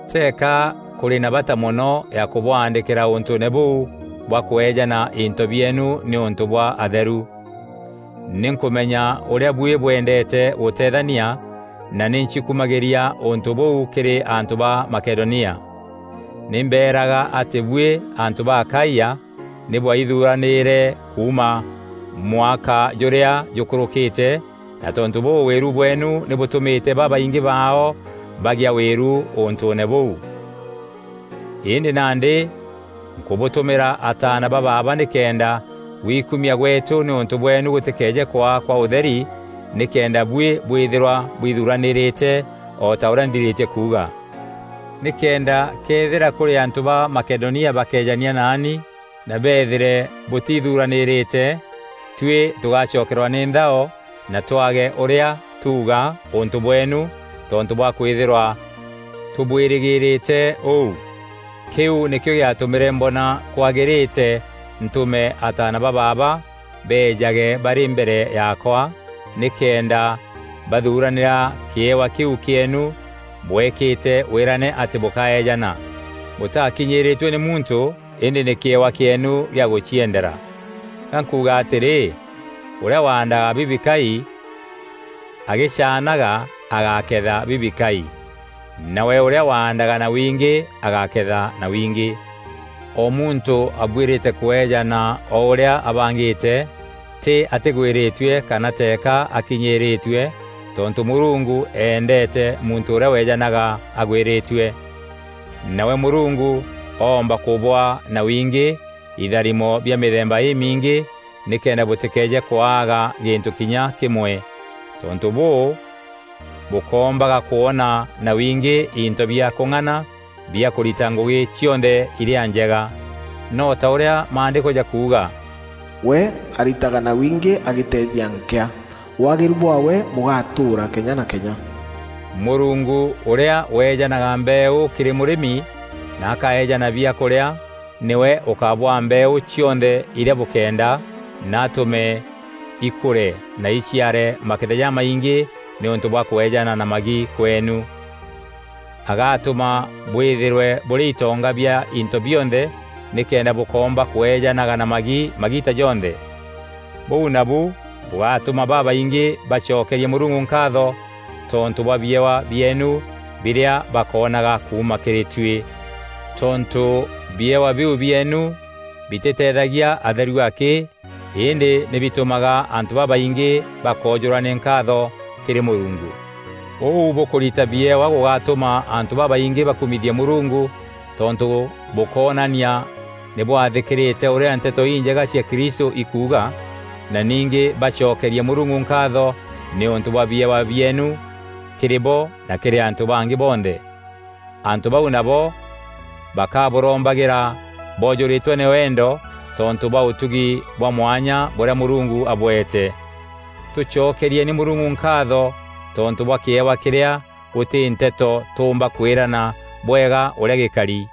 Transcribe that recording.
Teeka kûrî na bata mono ya kûbwaandîkîra ûntûûne bûu bwa kweejana into bieenu nîûntû bwa atheru. Nî nkûmenya ûrîa buî bwendeete gûteethania na nî ncikumagîria ûntû bûu kîrî antû ba Makedonia. Nî mbeeraga atî buî antû ba Akaia nî bwaithuranîîre kuuma mwaka jûrîa jûkûrûkîte na tontû bûû wîru bweenu nî bûtûmîte babaingî baao bagîa wîru ûntûûne bûu. Îndî nandî nkûbûtûmîra ataana ba baaba nîkenda gwikumia gweetû nîûntû bweenu gûtîkeeje kwaa kwa ûtheri nîkenda buî bwîthîrwa bwithuranîrîte o ta ûrîa nthirîtie kuuga. Nîkenda këethîra kûrî antû ba Makedonia bakeejania naani na beethîre bûtithuranîrîte, tuî tûgacokerwa nî nthao na twaage ûrîa tuuga ûntû bweenu tontû bwa kwîthîrwa tûbwîrîgîrîte ûu. Kîu nîkîo gîatûmîre mbona kwagîrîte ntûme ataana ba baaba beejage barî mbere yaakwa, nîkenda bathuranîra kîewa kîu kîeenu bwekîte wîrane atî bûkaeejana. Bûtakinyîîrîtue nî muntû îndî nî kîewa kîeenu gîa gûciendera. Ga nkuuga atîrî, ûrîa waandaga bibikai agîcaanaga agaketha bibikai, nawe ûrîa waandaga na wingî agaketha na wingî. O muntû abuîrîte kûeejana o ûrîa abangîte, tî atîgwîrîtue kana teeka akînyîîrîtue tontû Mûrungu eendeete muntû ûrîa weejanaga agwîrîtue. Nawe Mûrungu oomba kûbûaa na wingî itharimo bia mîthemba îmiingî nîkenda bûtîkeeje kwaaga gîntû kinya kîmwe. Tontû bûû, bûkoombaga kwona na wingî into bia kûng'ana bia kûrita ngûgî cionthe irîa njega. No ta ûrîa Maandîko jakuuga, “We aritaga na wingî agiteethia nkîa; Waagîru bwaawe bûgatûûra kenya na kenya,” Mûrungu ûrîa weejanaga mbeeû kîrî mûrîmi na akaeejana biakûrîa nîwe ûkabwaa mbeeû cionthe irîa bûkenda na atûme ikûre na iciare maketha jamaingî nîûntû bwa kweejana na magi kweenu. Agatûma bwîthîrwe bûrî itonga bia into bionthe nîkenda bûkoomba kweejanaga na magi magiita jonthe. Bûu nabu bûgatûma babaingî bacokerie Mûrungu nkaatho tontû bwa biewa bieenu birîa bakoonaga kuuma kîrî tuî. Tontû biewa biu bieenu bitîteethagia atheru akî îndî nî bitûmaga antû babaingî bakoojûrwa nî nkaatho kîrî Mûrungu. Ûu bûkûrita biewa gûgatûma antû babaingî bakumithie Mûrungu tontû bûkoonania nî bwathîkîrîte ûrîa Nteto Injega cia Kristû ikuuga na ningî bacokerie Mûrungu nkaatho nîûntû bwa biewa bieenu kîrî bo na kîrî antû bangî bonthe. Antû bau nabo bakabûrombagîra boojûrîtwe nî wendo tontû bwa ûtugi bwa mwanya bûrîa Mûrungu abweete. Tûcokerieni Mûrungu nkaatho tontû bwa kîewa kîrîa gûtî nteto tûûmba kwîrana bwega ûrîa gîkari.